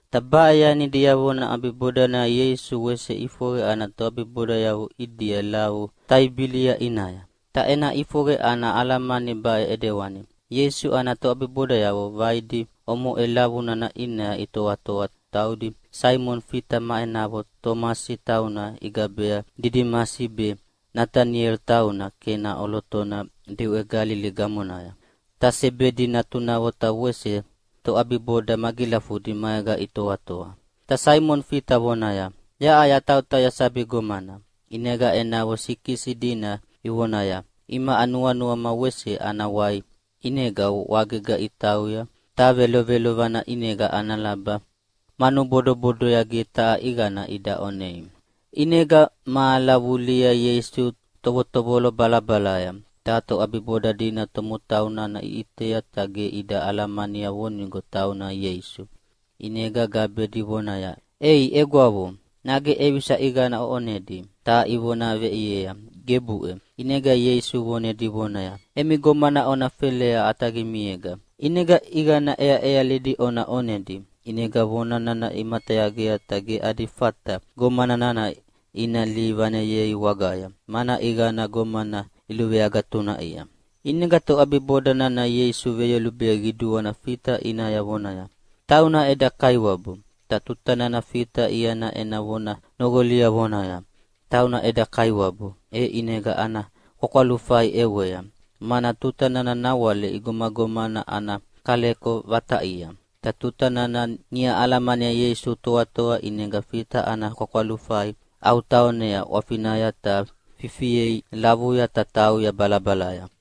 Ta baʼe yani diavona ʼabibodanaya Ieisu wese ʼifoqe ana toʼabibodayavo ʼidia lavu Taibilia ʼinaya. Ta ena ʼifoqe ana alamani baʼe ʼidewani: Ieisu ana toʼabibodayavo vaidi omoʼe lavu nana ʼinaya itoatoa, taudi Saimoni Fita ma enavo Tomasi tauna igabea Didimasi be, Nataniela tauna Kena ʼolotona diʼwe Galili gamonaya. Ta Sebedi natunavo ta wese toʼabiboda magilafudi maega itoatoa. Ta Saimoni Fita vonaya, “Yaʼa yatautauya sabi gomana.” ʼInega enavo sikisi dina ivoneaya, “Imaʼa nuanuama wese ana wai!” ʼInega wagega itauya, ta velovelovana ʼinega ana laba manu bodobodoya ge taha ʼiqana ida ʼonei. ʼInega mahala vulihia Ieisu tovotovolo balabalaya, ta toʼabiboda dina tomotau nana iʼitea ta ge ida alamania vonigo tauna Ieisu. ʼInega gabedi vonaya, “Ei egwavo, nage ʼevisa ʼiqana oʼonedi?” Ta ivona veʼiea, “Gebuʼe!” ʼInega Ieisu vonedi vonaya, “Emi gomana ona felea ʼataqimiega, ʼinega ʼiqana ʼeaʼealidi ona ʼonedi!” ʼInega vona nana imatayagea ta ge adi fata gomana nana ina lihi vaneyei wagaya, mana ʼiqana gomana iluveagatunaʼia. ʼInega toʼabiboda nana Ieisu veyolubea qiduana Fita ʼinaya vonaya, “Tauna eda Kaiwabu!” Ta tuta nana Fita iana ena vona noqolia vonaya, “Tauna eda Kaiwabu!” e ʼinega ana kwakwalufai ʼewea, (mana tuta nana nawale igomagomana ana kaleko vataʼia). Ta tuta nana niʼa alamania Ieisu toatoa ʼinega Fita ana kwakwalufai ʼautaonea ʼwafinaya ta fifiea lavuya ta tauya balabalaya.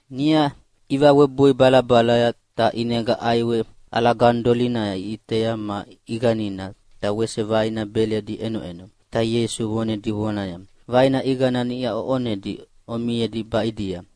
Niʼa ivawebui balabalaya, ta ʼinega ʼaiwe ʼalaganidolina iʼitea ma ʼiqanina, ta wese vaina beledi ʼenoʼeno. Ta Ieisu vonedi vonaya, “Vaina ʼiqana niʼa oʼonedia omiedi baʼidia.”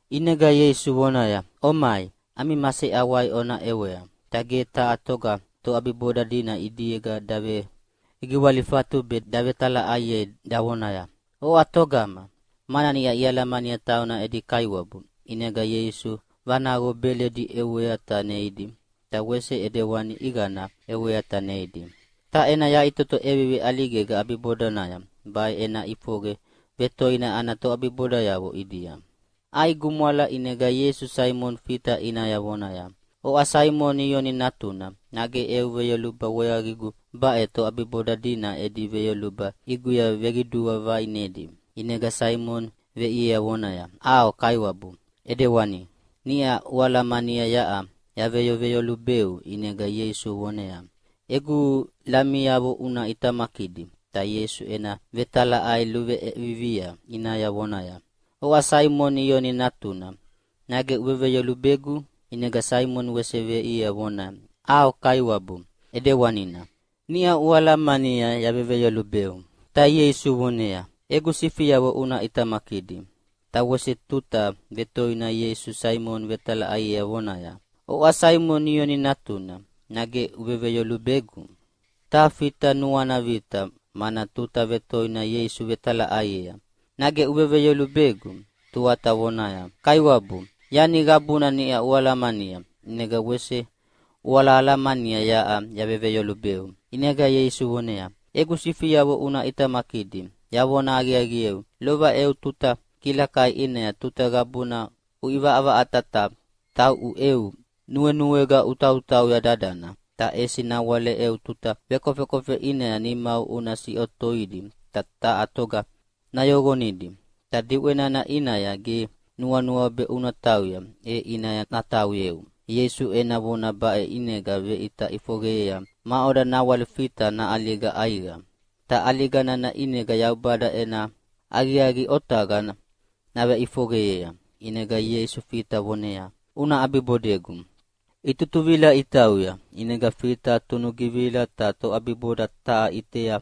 ʼInega Ieisu vonaya, “Omai, ami maseʼawai ona ʼewea!” Ta ge taha toga toʼabiboda dina ʼidiega davegiwalifatu be davetalaʼaiei davonaya, “Oʼa togama?”, mana niʼa ialamania tauna edi Kaiwabu. ʼInega Ieisu vanaqo beledi ʼewea ta neidi, ta wese ʼidewani ʼiqana ʼewea ta neidi. Ta ena yaʼitoto ʼevivi ʼaligega ʼabibodanaya, baʼe ena ʼifoqe vetoina ana toʼabibodayavo ʼidia. ʼAi gumwala ʼinega Ieisu Saimoni Fita ʼinaya vonaya, “Oʼa Saimoni Ioni natuna, nage eu veyoluba weaqigu baʼe toʼabiboda dina edi veyoluba ʼiguya veqidua vaʼinedi?” ʼInega Saimoni veʼiea vonaya, “ʼAo Kaiwabu, ʼidewani. Niʼa ualamania yaʼa yaveveyolubeu.” ʼInega Ieisu voneaya, “Egu lamiavo una ʼitamakidi.” Ta Ieisu ena vetalaʼai luʼeviviea ʼinaya vonaya, “Oʼa Saimoni Ioni natuna, nage uveveyolubegu?” ʼInega Saimoni wese veʼiea vonaya, “ʼAo Kaiwabu, ʼidewanina. Niʼa ualamania yaveveyolubeu.” Ta Ieisu voneaya, “Egu sifiavo una ʼitamakidi.” Ta wese tuta vetoina Ieisu Saimoni vetalaʼaiea vonaya, “Oʼa Saimoni Ioni natuna, nage uveveyolubegu?” Ta Fita nuana vita, mana tuta vetoina Ieisu vetalaʼaiea, “Nage uveveyolubegu?” Tuata voneaya, “Kaiwabu, yani qabuna niʼa ualamania, ʼinega wese ualahalamania yaʼa yaveveyolubeu!” ʼInega Ieisu voneaya, “Egu sifiavo una ʼitamakidi! Yavona aqiaqieu, lova eu tuta kilakai ʼinaya tuta qabuna uʼivaʼavaʼata ta tauʼu eu nuenuega utautauya dadana. Ta ʼesi nawale eu tuta vekofekofe ʼinaya nimau una siʼotoidi ta taha toga nayoqonidi, ta diʼwe nana ʼinaya ge nuanuau be una tauya, e ʼinaya natauyeu.” Ieisu ena vona baʼena ʼinega veʼita ʼifoqeyea maʼoda nawale Fita naʼaliga ʼaiqa, ta ʼaliga nana ʼinega Yaubada ena aqiaqi otaqa naveʼifoqeyea. ʼInega Ieisu Fita voneaya, “Una ʼabibodegu!” Itutuvila itautauya, ʼinega Fita tunugivila ta toʼabiboda taha ʼitea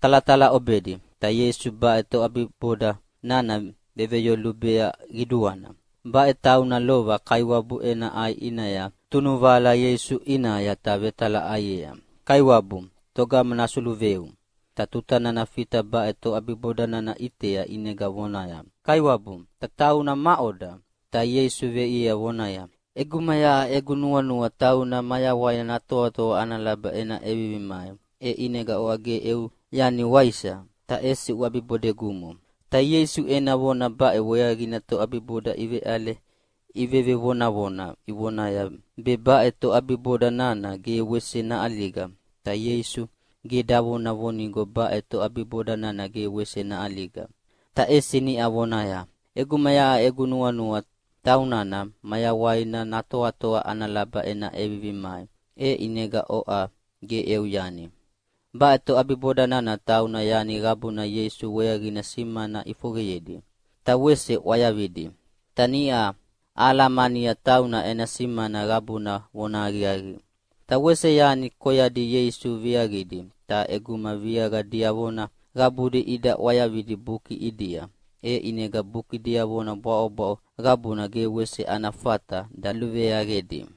talatalaʼobedi. Ta Ieisu baʼe toʼabiboda nana veveyolubea qiduana. Baʼe taunana lova Kaiwabu ena ʼai ʼinaya tunuvahala Ieisu ʼinaya ta vetalaʼaiea, “Kaiwabu, togama nasuluveu?” Ta tuta nana Fita baʼe toʼabiboda nana ʼitea ʼinega vonaya, “Kaiwabu, ta tauna maʼoda?” Ta Ieisu veʼiea vonaya, “ʼEguma yaʼa egu nuanua tauna mayawaina natoatoa ana laba ena ʼevivi mai, e ʼinega oʼa ge eu yani, waisa? Ta ʼesi uʼabibodegumo!” Ta Ieisu ena vona baʼe weaqina toʼabiboda iveʼale ivevonavona ivonaya be baʼe toʼabiboda nana ge wese naʼaliga. Ta Ieisu ge davona vonigo baʼe toʼabiboda nana ge wese naʼaliga, ta ʼesi niʼa vonaya, “ʼEguma yaʼa egu nuanua taunana mayawaina natoatoa ana laba ena ʼevivi mai, e ʼinega oʼa ge eu yani.” Baʼe toʼabiboda nana tauna yani qabuna Ieisu weaqina simana ʼifoqeyedi, ta wese ʼwayavidi. Ta niʼa ahalamania tauna ena simana qabuna vonahaqiaqi. Ta wese yani koyadi Ieisu viaqidi, ta ʼeguma viaqa diavona qabudi ida ʼwayavidi buki ʼidia, e ʼinega buki diavona bwaʼobwaʼo qabuna ge wese ana fata daluveaqedi.